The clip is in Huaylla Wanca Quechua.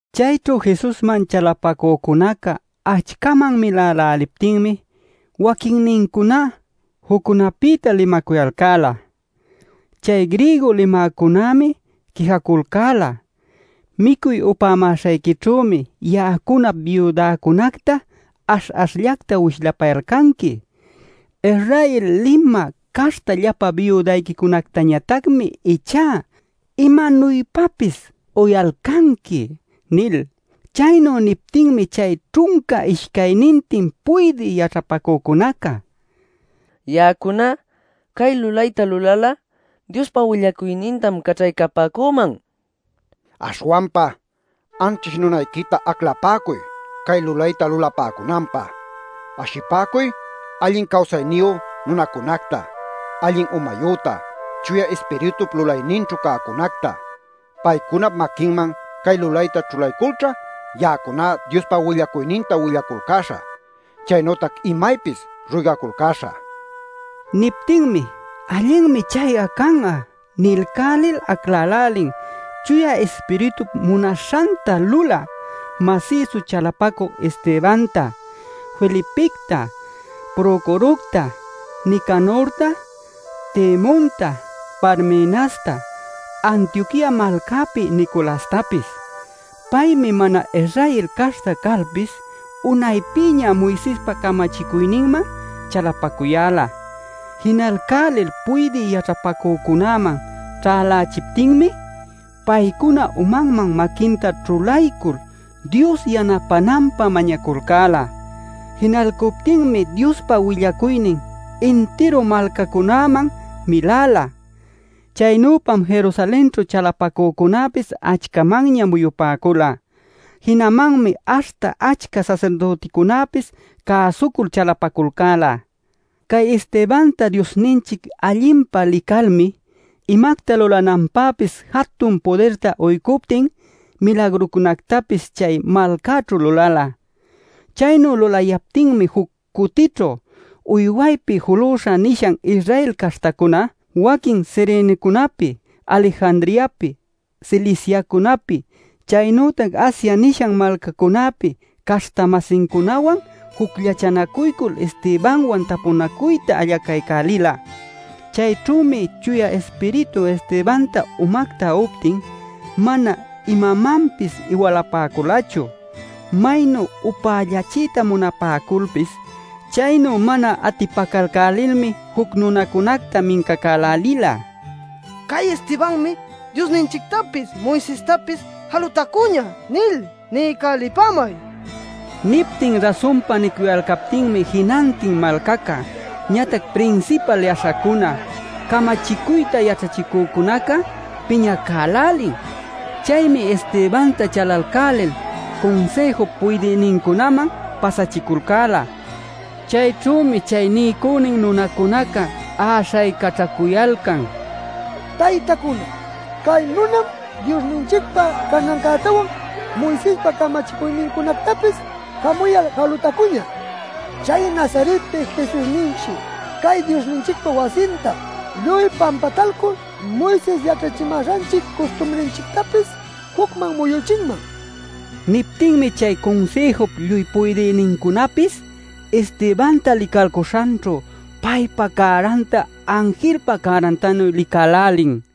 Chayćhu Jesusman chalapacücuna achcaman miläläliptinmi waquinnincuná juccunäpïta limacuyalcäla. Chay griego limäcunämi quijaculcäla: “Micuy upämäśhayquićhümi ya'acunap biudäcunacta ash-ashllacta wishlapayalcanqui. Israel limä caśhta llapa biudayquicunactañatacmi ichá imanuypapis uyalcanqui” nil. Chaynu niptinmi chay ćhunca ishcaynintin puydï yaćhapacücunaca: “Ya'acuna cay lulayta lulal'a Diospa willacuynintam caćhaycapäcüman. Aśhwanpa, anćhish nunayquita aclapäcuy cay lulayta lulapäcunanpä. Ashipäcuy allin cawsayniyu nunacunacta, allin umayüta, Chuya Ispiritup lulayninćhu cäcunacta. Paycunap maquinman cay lulayta ćhulayculćha ya'acuná Diospa willacuyninta willaculcäśhä chaynütac imaypis ruygaculcäśhä” nipäcula. Niptinmi “Allinmi chay'a can'a” nilcälil aclälälin Chuya Ispiritup munaśhanta lulä, masïsu chalapacü Estebanta, Felipicta, Procorocta, Nicanorta, Timonta, Parmenasta, Antioquia malcäpi Nicolastapis. (Paymi mana-Israel caśhta calpis unaypïña Moisespa camachicuyninman chalapacuyäla.) Jinalcälil puydï yaćhapacücunäman ćhälächiptinmi paycuna umanman maquinta ćhulaycul Dios yanapänanpä mañaculcäla. Jinalcuptinmi Diospa willacuynin intiru malcacunäman milala. Chaynüpam Jerusalenćhu chalapacücunäpis achcamanña muyupäcula. Jinamanmi aśhta achca sasirdüticunapis cäsucul chalapaculcäla. Cay Estebanta Diosninchic allinpa licalmi, imacta lulananpäpis jatun pudirta uycuptin milagrucunactapis chay malcäćhu lulala. Chaynu lulayaptinmi juc cutićhu “Uywaypi Juluśha” nishan Israel caśhtacuna, waquin Cirenecunapi, Alejandriapi, Ciliciacunapi, chaynütac Asia nishan malcacunäpi caśhta-masincunawan jucllachanacuycul Estebanwan tapunacuyta allacaycälila. Chayćhümi Chuya Ispiritu Estebanta umacta uptin mana imanmanpis iwalapäculachu, maynu upällachiyta munapäculpis. Chaynu mana atipacalcälilmi juc nunacunacta mincacälälila: “ ‘Cay Estebanmi Diosninchictapis, Moisestapis jalutacuñä’ nil niycälipamay” nil. Niptin rasunpa nicuyalcaptinmi, jinantin malcaca, ñatac prinsipal yaśhacuna, camachicuyta yaćhachicücunaca piñacälälin. Chaymi Estebanta chalalcälil Cunsïjup puydïnincunäman pasachiculcäla. Chayćhümi chay niycünin nunacunaca äśhaycaćhacuyalcan: “Taytacuna, cay nunam Diosninchicpa canancätawan Moisespa camachicuynincunactapis jamuyal jalutacuñä. Chay Nazaretpi Jesusninshi cay Diosninchicpa wasinta lluy pampatalcul Moises yaćhachimäśhanchic custumrinchictapis jucman muyüchinman” nil. Niptinmi chay Cunsïjup lluy puydïnincunapis Estebanta licalcuśhanćhu, paypa cäranta anjilpa cärantanuy licälälin.